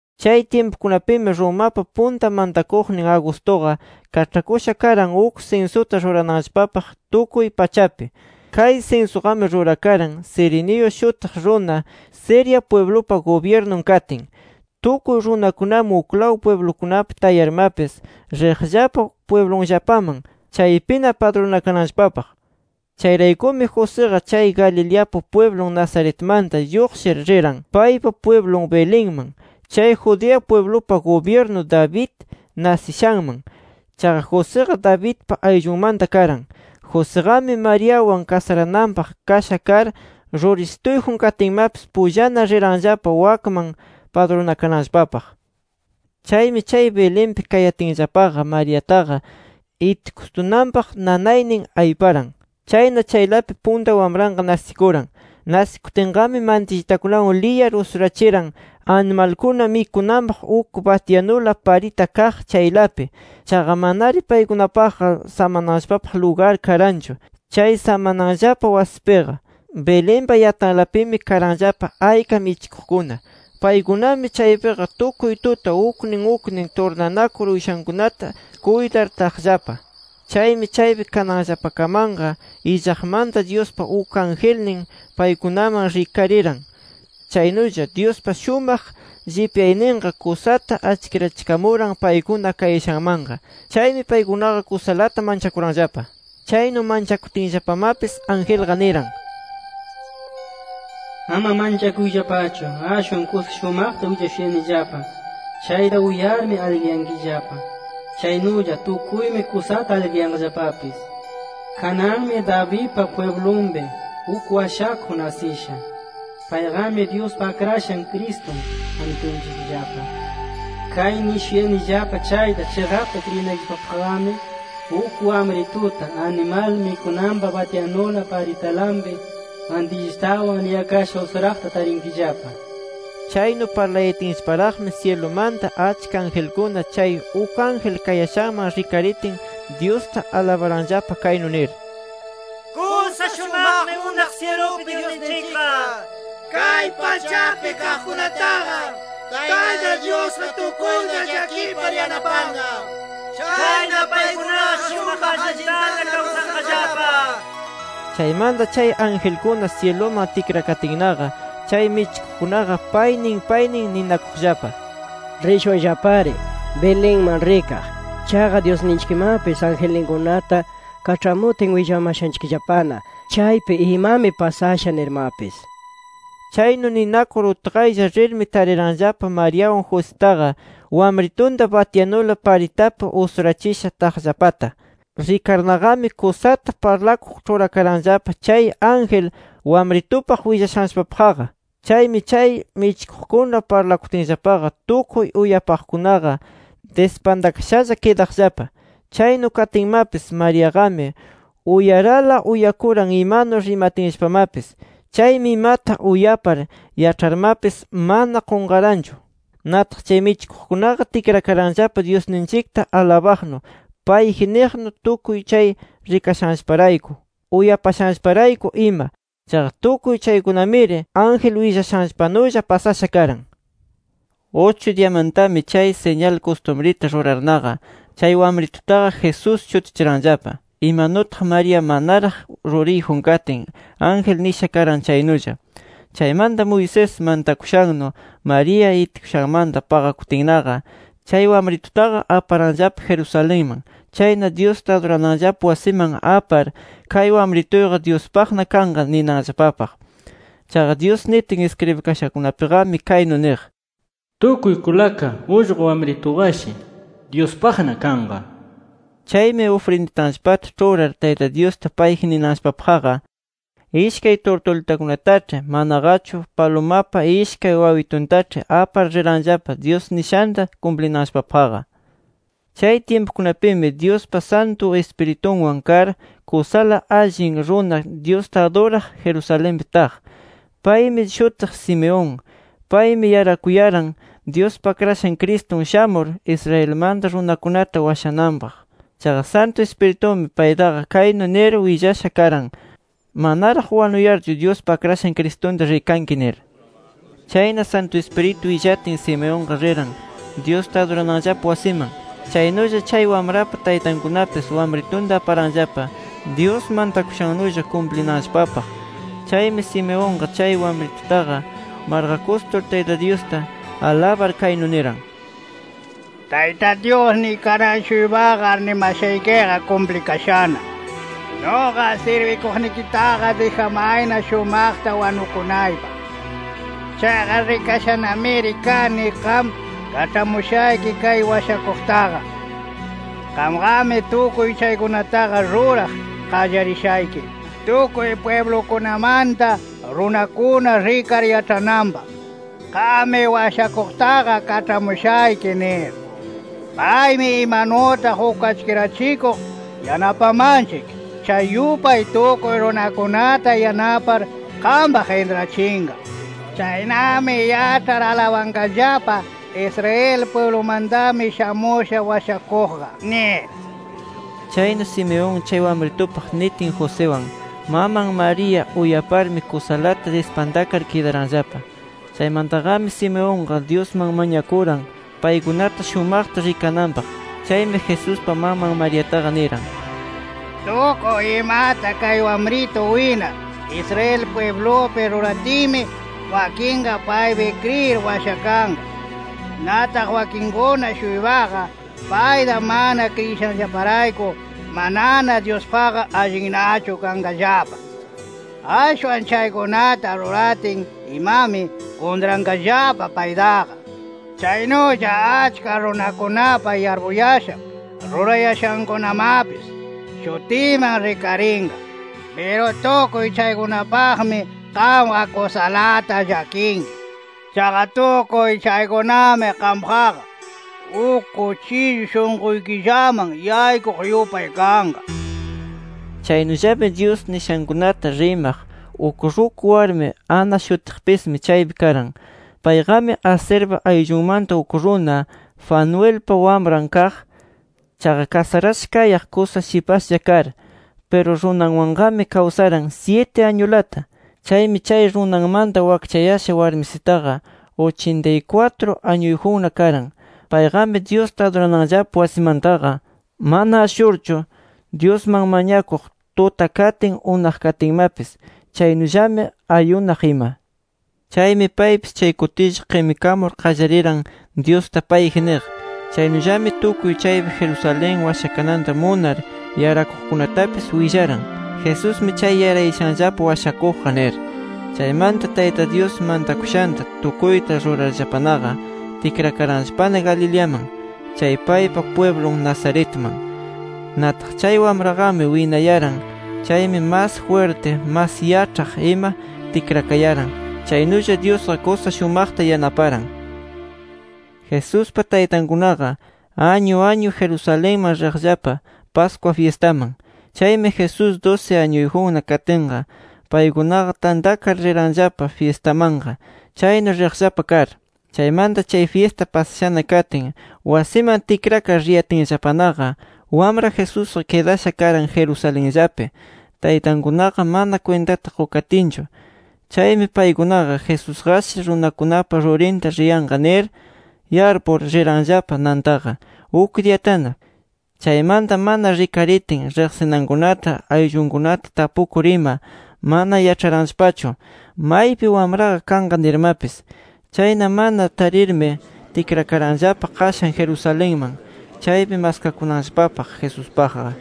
Chay tyimpukunapimi, Romapa punta mantakuqnin Augustuqa, kaĉhakusha karan uk sinsuta rurananllapapaq tukuy pachapi. Kay sinsuqami rurakaran Cirenio shutiq runa, Siria pwiblupa gubyirnun katin. Tukuy runakunami uklaw pwiblukunapi tayarmapis, riqllapa pwiblunllapaman chaypina padrunakananllapapaq. Chayraykumi, Josiqa chay Galileapa pwiblun Nazaretmanta lluqshir, riran paypa pwiblun Belenman, chay Judea pwiblupa gubyirnu David nasishanman. Chaqa Josiqa, Davidpa ayllunmanta karan. Josiqami, Mariawan kasarananpaq kasha kar, rurisituyjun katinmapis, pullana riranllapa wakman padrunakananllapapaq. Chaymi chay Belenpi kayatinllapaqa, Mariataqa itikustunanpaq nanaynin ayparan. Chayna, chaylapi punta wamranqa nasikuran. Nasikutinqami, mantillitakunawan liyar usurachiran, animalkuna mikunanpaq uk batyanula parita kaq chaylapi. Chaqa, manari paykunapaqqa samananllapapaq lugar karanchu, chay samananllapa wasipiqa. Belenpa yatanlapimi, karanllapa ayka michikuqkuna. Paykunami chaypiqa tukuy tuta uknin uknin turnanakur uyshankunata kuytar taqllapa. Chaymi chaypi kananllapakamanqa, illaqmanta Dyuspa uk angelnin paykunaman rikariran. Chaynulla, Dyuspa shumaq llipyayninqa kusata achkirachikamuran paykuna kayashanmanqa. Chaymi paykunaqa kusalata manchakuranllapa. Chaynu manchakutinllapamapis, angelqa niran: “Ama manchakuyllapachu. Ashwan kusa shumaqta willashuyanillapa chayta uyarmi aligriyankillapa. Chaynulla tukuymi kusata aligriyanqallapapis. Kananmi Davidpa pwiblunpi, uk washakuq nasisha. Payqami Dyuspa Akrashan Cristun, Amitunchikllapa. Kay nishuyanillapa chayta chiqapta kriyinaykillapapaqqami, uk wamrituta, animal mikunanpa batyanula paritanlapi mantillitawan liyakasha usuraqta tarinkillapa” nir. Chaynu parlayatinllaparaqqami, syilumanta achka angelkuna chay uk ángel kayashanman rikaritin, Dyusta alabaranllapa kaynu nir: “¡Kusa shumaqmi unaq syilupi Dyusninchikqa! ¡Kay pachapi kaqkunataqa, Tayta Dyusqa tukuyta llakipar yanapanqa! ¡Chayna, paykunaqa shumaq allintana kawsanqallapa!” Chaymanta chay angelkuna syiluman tikrakatinnaqa, chay michikuqkunaqa paynin paynin ninakuqllapa: “Rishunllapari Belenman rikaq. Chaqa Dyusninchikmapis angelninkunata kaĉhamutin, willamashanchikllapana chaypi imami pasasha nirmapis”. Chaynu ninakur utqaylla rirmi, tariranllapa Mariawan Jositaqa wamritunta batyanula paritapi usurachisha taqllapata. Rikarnaqami, kusata parlakuq ĉhurakaranllapa chay ángel wamritupaq willashanllapapaqqa. Chaymi chay michikuqkuna parlakutinllapaqa, tukuy uyapaqkunaqa, dispantakashalla kidaqllapa. Chaynu katinmapis, Mariaqami uyarala uyakuran imanu rimatinllapamapis. Chaymi imata uyapar yaĉharmapis, mana qunqaranchu. Nataq, chay michikuqkunaqa tikrakaranllapa Dyusninchikta alabaqnu, payji niqnu, tukuy chay rikashanllaparayku, uyapashanllaparayku ima. Chaqa, tukuy chaykunamiri, ángel willashanllapanulla pasasha karan. Uchu diyamantami, chay siñal kustumrita rurarnaqa, chay wamritutaqa Jesús shutichiranllapa, imanutaq María manaraq ruriyjun katin, ángel nisha karan chaynulla. Chaymanta Moisés mantakushannu María itikushanmanta paqakutinnaqa, chay wamritutaqa aparanllapa Jerusalenman. Chayna Dyusta adurananllapa wasiman apar, kay wamrituyqa Dyuspaqna kanqa ninanllapapaq. (Chaqa, Dyus nitin iskribikashakunapiqami kaynu niq: “Tukuy kulaka ullqu wamrituqashi Dyuspaqna kanqa” nir). Chaymi ufrinditanllapata ĉhurar, Tayta Dyusta payji ninanllapapaqqa, ishkay turtulitakunataĉhi manaqachu palumapa ishkay wawituntaĉhi apar riranllapa, Dyus nishanta kumplinanllapapaqqa. Chay tyimpukunapimi, Dyuspa Santu Ispiritunwan kar kusala allin runa, Dyusta aduraq Jerusalenpi taq. Paymi shutiq Simeón. Paymi yarakuyaran Dyuspa Akrashan Cristun shamur Israelmanta runakunata washananpaq. Chaqa Santu Ispiritumi paytaqa kaynu nir willasha karan: Manaraq wanuyarchu Dyuspa Akrashan Cristunta rikanki nir. Chayna, Santu Ispiritu willatin, Simeonqa riran Dyusta adurananllapa wasiman. Chaynulla chay wamrapa taytankunapis wamritunta aparanllapa Dyus mantakushannulla kumplinanllapapaq. Chaymi, Simeonqa chay wamritutaqa marqakustur, Tayta Dyusta alabar kaynu niran: “Tayta Dyusniy, kanan-shuypaqa arnimashaykiqa kumplikashana. Nuqa sirbikuqnikitaqa dijamayna shumaqta wanukunaypaq. Chaqa rikashanamiri kani qam kaĉhamushayki kay Washakuqtaqa. Qamqami tukuy chaykunataqa ruraq qallarishayki tukuy pwiblukunamanta runakuna rikar yaĉhananpaq qammi Washakuqtaqa kaĉhamushayki nir. Paymi imanutaq uk achkirachikuq yanapamanchik, chay yupay tukuy runakunata yanapar qampaq intrachinqa. Chaynami yaĉhar alabanqallapa Israel pwiblumantami shamusha Washakuqqa nir”. Chaynu Simeón chay wamritupaq nitin Josiwan, maman María uyaparmi kusalata dispantakar kidaranllapa. Chaymantaqami Simeonqa Dyusman mañakuran, paykunata shumaqta rikananpaq. Chaymi Jesuspa maman Mariataqa niran: “Tukuy imata, kay wamritu winar Israel pwiblupi ruratinmi, wakinqa paypi kriyir washakanqa. Nataq wakinkuna-shuypaqa, payta mana kriyishanllaparayku, manana Dyuspaqqa allinnachu kanqallapa. Ashwan chaykunata ruratin imami, kuntranqallapa paytaqa. Chaynulla achka runakunapa yarpuyashan, rurayashankunamapis, shutiman rikarinqa. Piru tukuy chaykunapaqmi qamqa kusalata llakinki. Chaqa, tukuy chaykunami qampaqqa, uk kuchillu shunquykillaman yaykuq yupay kanqa”. Chaynullami Dyus nishankunata rimaq uk ruku warmi Ana shutiqpismi chaypi karan. Payqami, Aserpa ayllunmanta uk runa Fanuelpa wamran kaq. Chaqa kasarasha kayaq kusa shipashlla kar. Piru runawanqami kawsaran syiti añulata. Chaymi chay runanmanta wakchayasha warmisitaqa uchintay kwatru añuyjunna karan. Payqami Dyusta adurananllapa wasimantaqa mana ashurchu Dyusman mañakuq tuta katin, unaq katinmapis. Chaynullami ayunaq ima. Chaymi, paypis chay kutilla qimikamur qallariran Dyusta payji niq. Chaynullami, tukuy chaypi Jerusalén washakananta munar yarakuqkunatapis willaran: “Jesusmi chay yarayashanllapa Washakuqqa” nir. Chaymanta Tayta Dyus mantakushanta tukuyta rurarllapanaqa, tikrakaranllapana Galileaman, chay paypa pwiblun Nazaretman. Nataq, chay wamraqami winayaran. Chaymi mas jwirti, mas yaĉhaq ima tikrakayaran. Chaynulla Dyusqa kusa shumaqta yanaparan. Jesuspa taytankunaqa añu añu Jerusalenman riqllapa Pascua fyistaman. Chaymi Jesús dusi añuyjunna katinqa paykunaqa tantakar riranllapa fyistamanqa, chaynu riqllapa kar. Chaymanta chay fyista pasashana katin, wasinman tikrar riyatinllapanaqa, wamra Jesusqa kidasha karan Jerusalenllapi, taytankunaqa mana kwintata qukatinchu. Chaymi, paykunaqa Jesusqashi runakunapa rurinta riyanqa nir yarpur, riranllapa nantaqa uk diyatana. Chaymanta mana rikaritin, riqsinankunata ayllunkunata tapukur ima, mana yaĉharanllapachu maypi wamranqa kanqa nirmapis. Chayna mana tarirmi, tikrakaranllapa qashan Jerusalenman, chaypi maskakunanllapapaq Jesuspaqqa.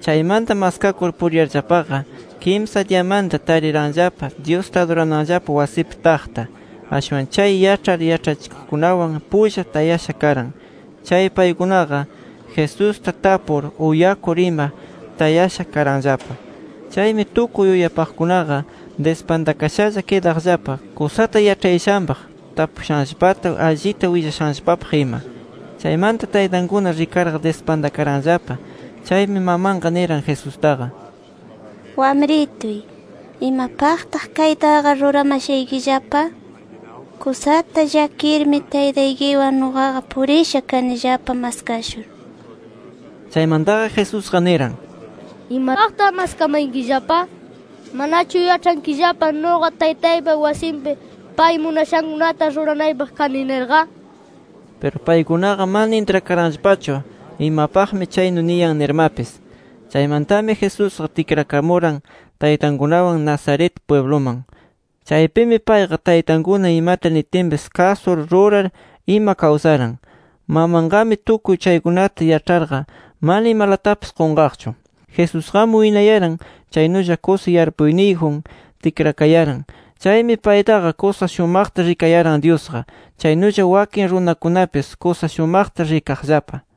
Chaymanta maskakur puriyarllapaqa, kimsa diyamanta tariranllapa Dyusta adurananllapa wasipi taqta. Ashwan chay yaĉhar yaĉhachikuqkunawan pulla tayasha karan. Chay paykunaqa, Jesusta tapur uyakur ima tayasha karanllapa. Chaymi tukuy uyapaqkunaqa dispantakashalla kidaqllapa, kusata yaĉhayashanpaq, tapushanllapata allita willashanllapapaq ima. Chaymanta taytankuna rikarqa, dispantakaranllapa. Chaymi mamanqa niran Jesustaqa: —Wamrituy, ¿imapaqtaq kaytaqa ruramashaykillapa? Kusata llakirmi taytaykiwan nuqaqa purisha kanillapa maskashur. Chaymantaqa Jesusqa niran: —¿Imapaqtaq maskamayankillapa? ¿Manachu yaĉhankillapa nuqa Taytaypa wasinpi, pay munashankunata ruranaypaq kani nirqa? Piru paykunaqa mana intrakaranllapachu imapaqmi chaynu niyan nirmapis. Chaymantami Jesusqa tikrakamuran taytankunawan Nazaret pwibluman. Chaypimi payqa taytankuna imata nitinpis kasur rurar ima kawsaran. Mamanqami tukuy chaykunata yaĉharqa, mana imalatapis qunqaqchu. Jesusqami winayaran. Chaynulla kusa yarpuyniyjun tikrakayaran. Chaymi paytaqa kusa shumaqta rikayaran Dyusqa. Chaynulla wakin runakunamapis, kusa shumaqta rikaqllapa.